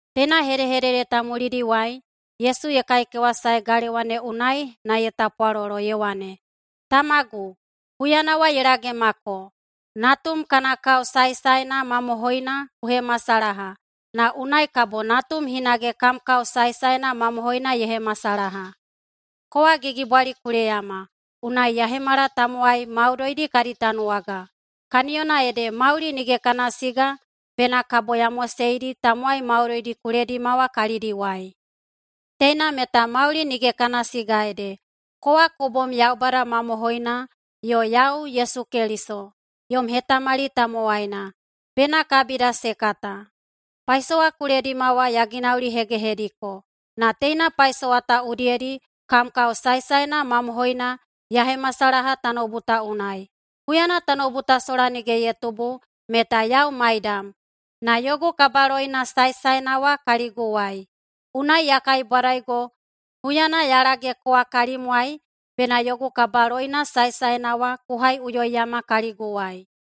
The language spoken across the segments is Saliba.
Teina hedehedede ta mulidiwai Yesu ye kaikewasae galewa ne unai na ye tapwalolo ye wane, “Tamagu, huyana wa ye lagemako. Natum kana kao saesaena mamohoina ku hemasalaha, na unai kabo Natum hinage kam kao saesaena mamohoina ye hemasalaha. Kowa gigibwali ku leyama, unai ya hemala tamowai maudoidi kadi tanuwaga. Kaniyona ede mauli nige kana siga bena kabo ya moseidi tamowai maudoidi ku ledima wa kalidiwai. Teina meta mauli nige kana siga ede: Kowa ku bom Yaubada mamohoina yo yau, Yesu Keliso, yom hetahetamali tamowaina, bena kabida se kata. Paisowa ku ledima wa ya ginaulihegehediko. Na teina paisowa ta udiyedi kam kao saesaena mamohoina ya hemasalaha tanoubu ta unai. Huyana tanoubu sola nige ye tubu, meta yau maidam na yogu kabaloina saesaena wa kaliguwai. Unai ya kaibwadaigo huyana ya lage kowa kalimwai bena yogu kabaloina saesaena wa ku haiꞌuyoiyama kaliguwai.”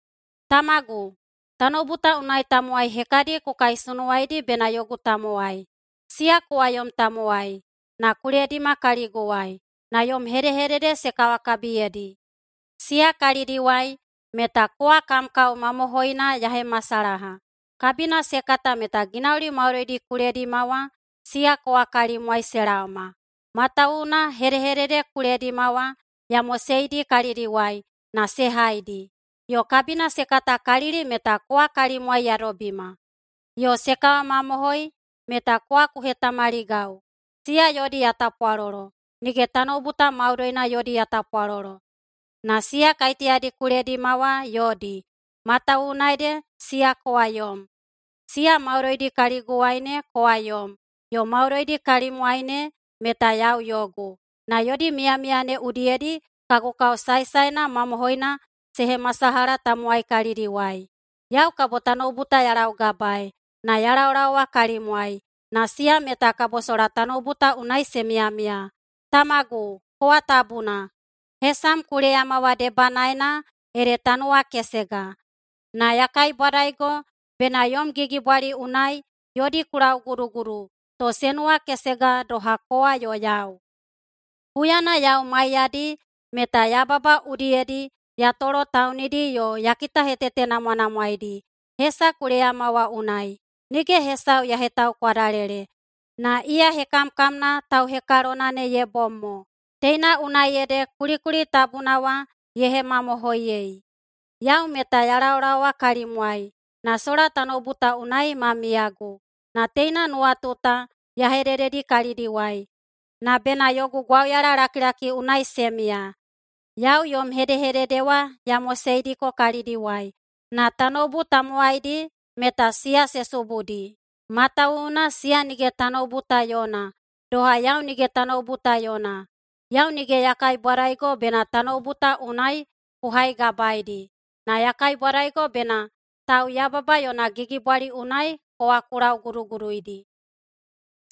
“Tamagu, tanoubu ta unai tamowai hekadi ku kaisunuwaidi bena yogu tamowai. Siya kowa yom tamowai, na ku ledima kaliguwai, na yom hedehedede se kawakabiyedi. Siya kalidiwai meta kowa kam kao mamohoina ya hemasalaha. Kabina se kata meta ginauli maudoidi ku ledima wa, siya kowa kalimwai se laoma. Matawuwuna hedehedede ku ledima wa ya moseidi kalidiwai na se haidi. Yo kabina se katakalili meta kowa kalimwai ya dobima. Yo se kawamamohoi meta kowa ku hetamaligau. Siya yodi ya tapwalolo. Nige tanoubu ta maudoina yodi ya tapwalolo, na siya kaiteyadi ku ledima wa yodi, matawuwuna ede siya kowa yom. Siya maudoidi kaliguwai ne kowa yom, yo maudoidi kalimwai ne meta yau yogu. Na yodi miyamiya ne udiyedi kagu kao saesaena mamohoina se hemasalaha tamowai kalidiwai. Yau kabo tanoubu ta ya laugabaei, na ya laolaowa kalimwai, na siya meta kabo sola tanoubu ta unai se miyamiya. Tamagu, kowa tabuna. Hesam ku leyama wa debanaena ede ta nuwakesega. Na ya kaibwadaigo bena yom gigibwali unai yodi ku laugudugudu, to se nuwakesega doha kowa yo yau. Huyana yau maiyadi meta yababa udiyedi ya tolotaunidi yo ya kitahetetenamwanamwaedi hesa ku leyama wa unai. Nige hesau ya hetaukwadalele, na iya hekamkamna tauhekalona ne ye bom mo. Teina unai ede kulikuli tabuna wa ye hemamohoiyei. Yau meta ya laolaowa kalimwai, na sola tanoubu ta unai ma miyagu, na teina nuwatu ta ya hedededi kalidiwai, na bena yogu gwauyalalakilaki unai se miya. Yau yom hedehedede wa ya moseidiko kalidiwai, na tanoubu tamowaidi meta siya se subudi, matawuwuna siya nige tanoubu ta yona doha yau nige tanoubu ta yona. Yau nige ya kaibwadaigo bena tanoubu ta unai ku haigabaeidi, na ya kaibwadaigo bena tauyababa yona gigibwali unai kowa ku lauguduguduidi.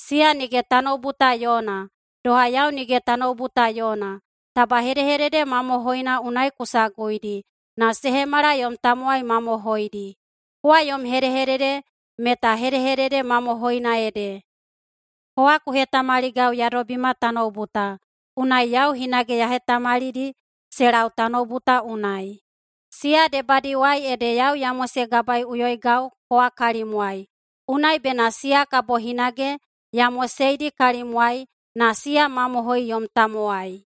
Siya nige tanoubu ta yona, doha yau nige tanoubu ta yona. Taba hedehedede mamohoina unai ku saguidi na se hemala yom tamowai mamohoidi. Kowa yom hedehedede meta hedehedede mamohoina ede. Kowa ku hetamaligau ya dobima tanoubu ta, unai yau hinage ya hetamalidi se lau tanoubu ta unai. Siya debadiwai ede yau ya mosegabaeiꞌuyoigau kowa kalimwai, unai bena siya kabo hinage ya moseidi kalimwai na siya mamohoi yom tamowai.”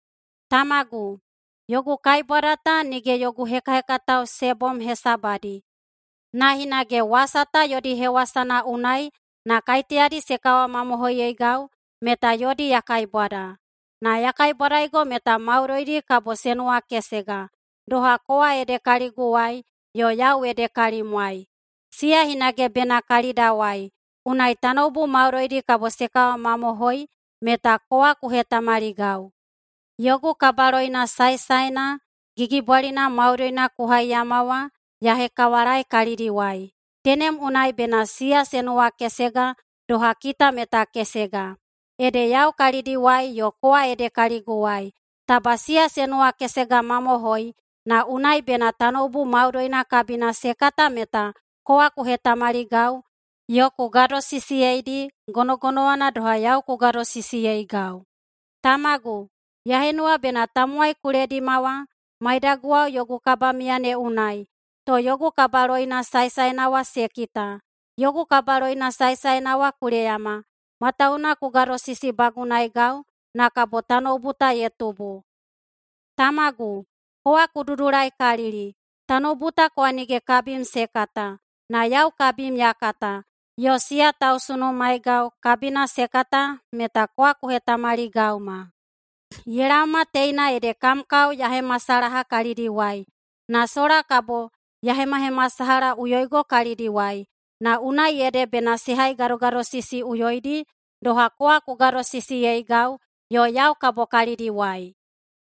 “Tamagu, yogu kaibwada ta nige yogu hekahekatao se bom hesabadi, na hinage wasa ta yodi hewasana unai na kaiteyadi se kawamamohoiyeigau meta yodi ya kaibwada. Na ya kaibwadaigo meta maudoidi kabo se nuwakesega, doha kowa ede kaliguwai yo yau ede kalimwai. Siya hinage bena kalidawai, unai tanoubu maudoidi kabo se kawamamohoi meta kowa ku hetamaligau. Yogu kabaloina saesaena gigibwalina maudoina ku haiyama wa ya hekawalaei kalidiwai. Tenem unai bena siya se nuwakesega doha kita meta kesega. Ede yau kalidiwai yo kowa ede kaliguwai. Taba siya se nuwakesegamamohoi, na unai bena tanoubu maudoina kabina se kata meta kowa ku hetamaligau, yo ku gadosisiyeidi gonogonowana doha yau ku gadosisiyeigau. Tamagu, ya henuwa bena tamowai ku ledima wa maidaguwao yogu kabamiya ne unai, to yogu kabaloina saesaena wa se kita. Yogu kabaloina saesaena wa ku leyama, matawuwuna ku gadosisibagunaegau na kabo tanoubu ta ye tubu. Tamagu, kowa ku dudulaikalili. Tanoubu ta kowa nige kabim se kata, na yau kabim ya kata, yo siya tausunumaegau kabina se kata meta kowa ku hetamaligauma. Ye laoma teina ede kam kao ya hemasalaha kalidiwai, na sola kabo ya hemahemasalahaꞌuyoigo kalidiwai, na unai ede bena se haigadogadosisiꞌuyoidi doha kowa ku gadosisiyeigau, yo yau kabo kalidiwai.”